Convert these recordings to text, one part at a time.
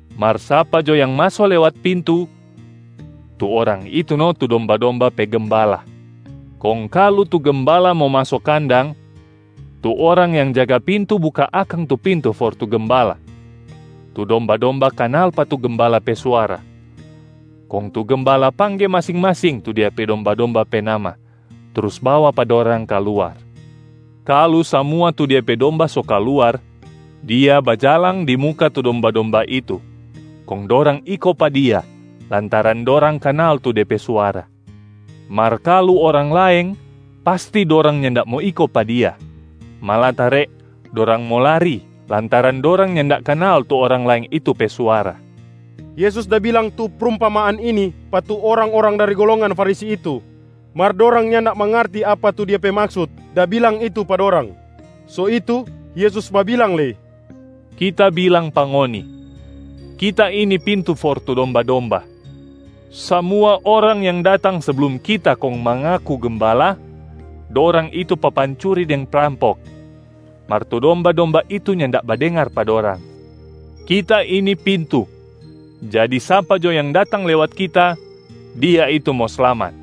Mar sapa jo yang maso lewat pintu, tu orang itu no tu domba-domba pe gembala. Kong kalu tu gembala mo maso kandang, tu orang yang jaga pintu buka akang tu pintu for tu gembala. Tu domba-domba kanal pa tu gembala pe suara, kong tu gembala pangge masing-masing tu dia pe domba-domba pe nama, trus bawa pa dorang kaluar. Kalu samua tu dia pe domba so kaluar, dia bajalang di muka tu domba-domba itu kong dorang iko pa dia lantaran dorang kanal tu de pe suara. Mar kalu orang laeng, pasti dorang nyanda mo iko pa dia, malatare dorang mo lari lantaran dorang nyanda kanal tu orang laeng itu pe suara.” Yesus da bilang tu prumpamaan ini pa tu orang-orang dari golongan Farisi itu, mar dorang nyanda mangarti apa tu Dia pe maksut da bilang itu pa dorang. So itu, Yesus babilang lei, “Kita bilang pa ngoni, Kita ini pintu for tu domba-domba. Samua orang yang datang seblum Kita kong mangaku gembala, dorang itu papancuri deng prampok, mar tu domba-domba itu nyanda badengar pa dorang. Kita ini pintu. Jadi sapa jo yang datang lewat Kita, dia itu mo slamat.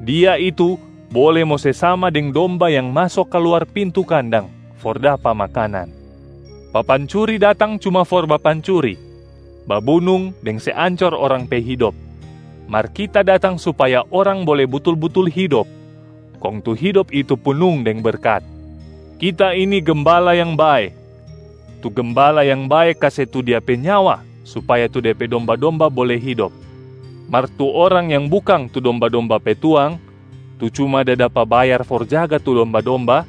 Dia itu bole mo se sama deng domba yang maso kaluar pintu kandang for dapa makanan. Papancuri datang cuma for bapancuri, babunung deng se ancor orang pe hidop. Mar Kita datang supaya orang bole butul-butul hidop, kong tu hidop itu punung deng berkat. Kita ini gembala yang bae. Tu gembala yang bae kase tu dia pe nyawa supaya tu de pe domba-domba bole hidop. Mar tu orang yang bukang tu domba-domba pe tuang, tu cuma da dapa bayar for jaga tu domba-domba,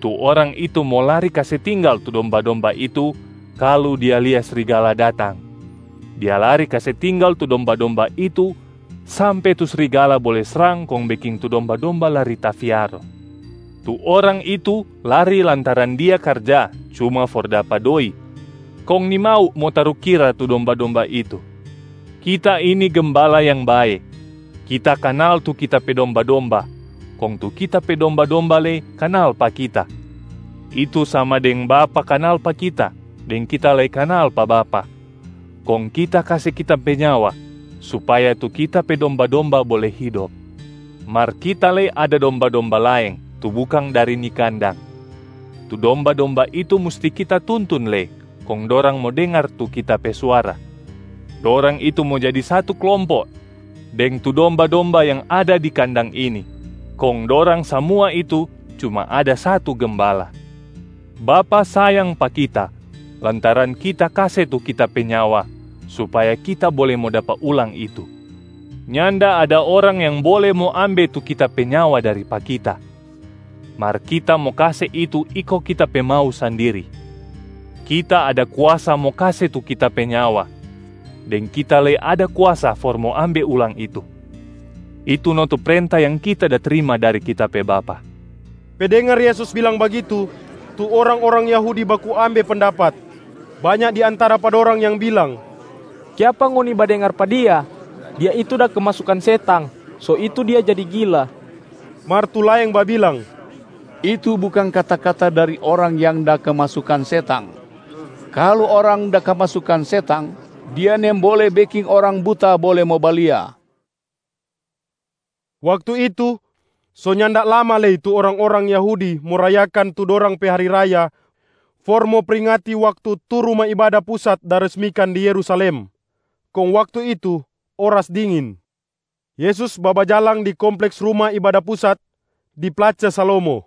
tu orang itu mo lari kase tinggal tu domba-domba itu kalu dia lia srigala datang. Dia lari kase tinggal tu domba-domba itu sampe tu srigala bole srang kong beking tu domba-domba lari tafiaro. Tu orang itu lari lantaran dia karja cuma for dapa doi kong nimau mo tarukira tu domba-domba itu. Kita ini gembala yang bae. Kita kanal tu Kita pe domba-domba kong tu Kita pe domba-domba lei kanal pa Kita, itu sama deng Bapa kanal pa Kita deng Kita lei kanal pa Bapa, kong Kita kase Kita pe nyawa supaya tu Kita pe domba-domba bole hidop. Mar Kita lei ada domba-domba laeng tu bukang dari ni kandang, tu domba-domba itu musti Kita tuntun lei kong dorang mo dengar tu Kita pe suara. Dorang itu mo jadi satu klompo deng tu domba-domba yang ada di kandang ini, kong dorang samua itu cuma ada satu gembala. Bapa sayang pa Kita lantaran Kita kase tu Kita pe nyawa supaya Kita bole mo dapa ulang itu. Nyanda ada orang yang bole mo ambe tu Kita pe nyawa dari pa Kita, mar Kita mo kase itu iko Kita pe mau sandiri. Kita ada kuasa mo kase tu Kita pe nyawa, deng Kita lei ada kuasa for mo ambe ulang itu. Itu no tu prenta yang Kita da trima dari Kita pe Bapa.” Pe dengar Yesus bilang bagitu, tu orang-orang Yahudi baku ambe pendapat. Banya di antara pa dorang yang bilang, “Kiapa ngoni badengar pa Dia? Dia itu da kemasukan setang, so itu Dia jadi gila.” Mar tu laeng babilang, “Itu bukang kata-kata dari orang yang da kemasukan setang. Kalu orang da kemasukan setang, dia nimbole beking orang buta bole mo balia.” Waktu itu, so nyanda lama lei tu orang-orang Yahudi mo rayakan tu dorang pe hari raya for mo pringati waktu tu Ruma Ibada Pusat da resmikan di Yerusalem. Kong waktu itu, oras dingin. Yesus babajalang di kompleks Ruma Ibada Pusat, di place Salomo.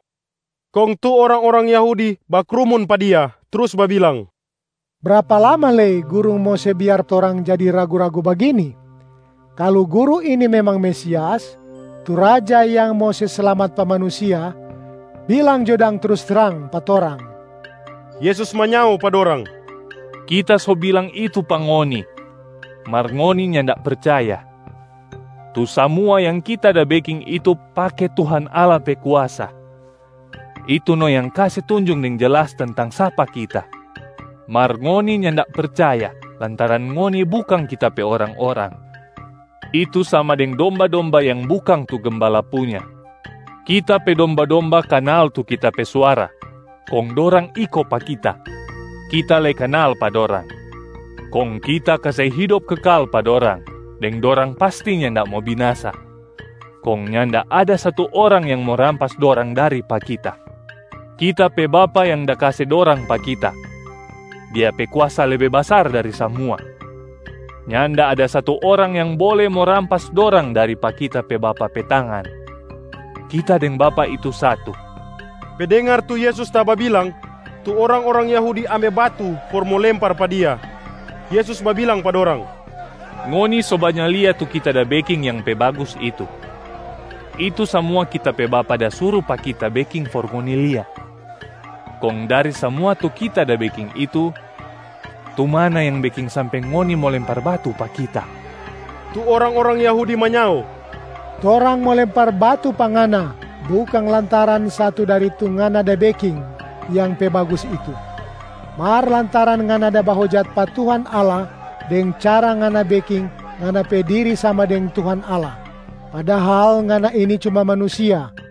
Kong tu orang-orang Yahudi bakrumun pa Dia trus babilang, “Brapa lama lei Guru mo se biar torang jadi ragu-ragu bagini? Kalu Guru ini memang Mesias, tu Raja yang mo se slamat pa manusia, bilang jo dang trus trang pa torang.” Yesus manyao pa dorang, “Kita so bilang itu pa ngoni, mar ngoni nyanda percaya. Tu samua yang Kita da beking itu pake Tuhan Allah pe kuasa, itu no yang kase tunjung deng jelas tentang sapa Kita. Mar ngoni nyanda percaya lantaran ngoni bukang Kita pe orang-orang, itu sama deng domba-domba yang bukang tu gembala punya. Kita pe domba-domba kanal tu Kita pe suara, kong dorang iko pa Kita. Kita lei kanal pa dorang. Kong Kita kase hidop kekal pa dorang deng dorang pasti nyanda mo binasa, kong nyanda ada satu orang yang mo rampas dorang dari pa Kita. Kita pe Bapa yang da kase dorang pa Kita, Dia pe kuasa lebe basar dari samua. Nyanda ada satu orang yang bole mo rampas dorang dari pa Kita pe Bapa pe tangan. Kita deng Bapa itu satu.” Pe dengar tu Yesus da bilang, tu orang-orang Yahudi ambe batu for mo lempar pa Dia. Yesus bilang pa dorang, “Ngoni so banya lia tu Kita da beking yang pe bagus itu, itu samua Kita pe Bapa da suru pa Kita beking for ngoni lia. Kong dari samua tu Kita da beking itu, tu mana yang beking sampe ngoni mo lempar batu pa Kita?” Tu orang-orang Yahudi manyao, “Torang mo lempar batu pa Ngana bukang lantaran satu dari tu Ngana da beking yang pe bagus itu, mar lantaran Ngana da bahojat pa Tuhan Allah deng cara Ngana beking Ngana pe diri sama deng Tuhan Allah, padahal Ngana ini cuma manusia.”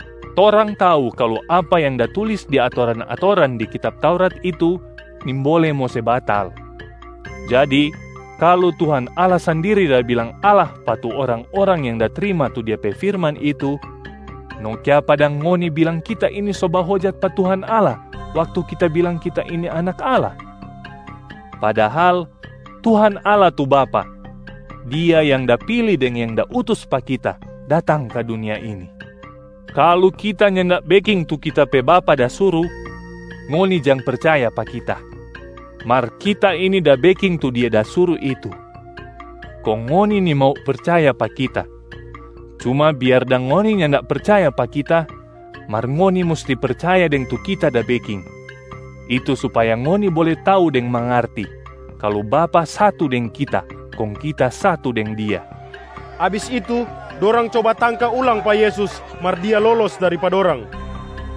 Torang tau kalu apa yang da tulis di atoran-atoran di kitab Taurat itu nimbole mo se batal, jadi kalu Tuhan Allah sandiri da bilang ‘allah’ pa tu orang-orang yang da trima tu Dia pe firman itu, no kiapa dang ngoni bilang Kita ini so bahojat pa Tuhan Allah waktu Kita bilang Kita ini Anak Allah? Padahal Tuhan Allah tu Bapa, Dia yang da pili deng yang da utus pa Kita datang ka dunia ini. Kalu Kita nyanda beking tu Kita pe Bapa da suru, ngoni jang percaya pa Kita. Mar Kita ini da beking tu Dia da suru itu, kong ngoni nimau percaya pa Kita. Cuma biar dang ngoni nyanda percaya pa Kita, mar ngoni musti percaya deng tu Kita da beking, itu supaya ngoni bole tau deng mangarti kalu Bapa satu deng Kita kong Kita satu deng Dia.” Abis itu, dorang coba tangka ulang pa Yesus mar Dia lolos dari pa dorang.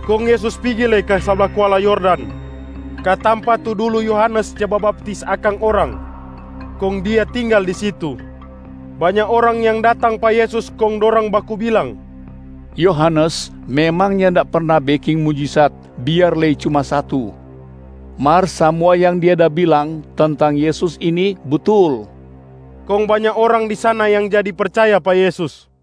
Kong Yesus pigi lei ka sabla kuala Yordan, ka tampa tu dulu Yohanes ja babaptis akang orang, kong Dia tinggal di situ. Banya orang yang datang pa Yesus kong dorang baku bilang, “Yohanes memang nyanda perna beking mujisat biar lei cuma satu, mar samua yang dia da bilang tentang Yesus ini butul.” Kong banya orang di sana yang jadi percaya pa Yesus.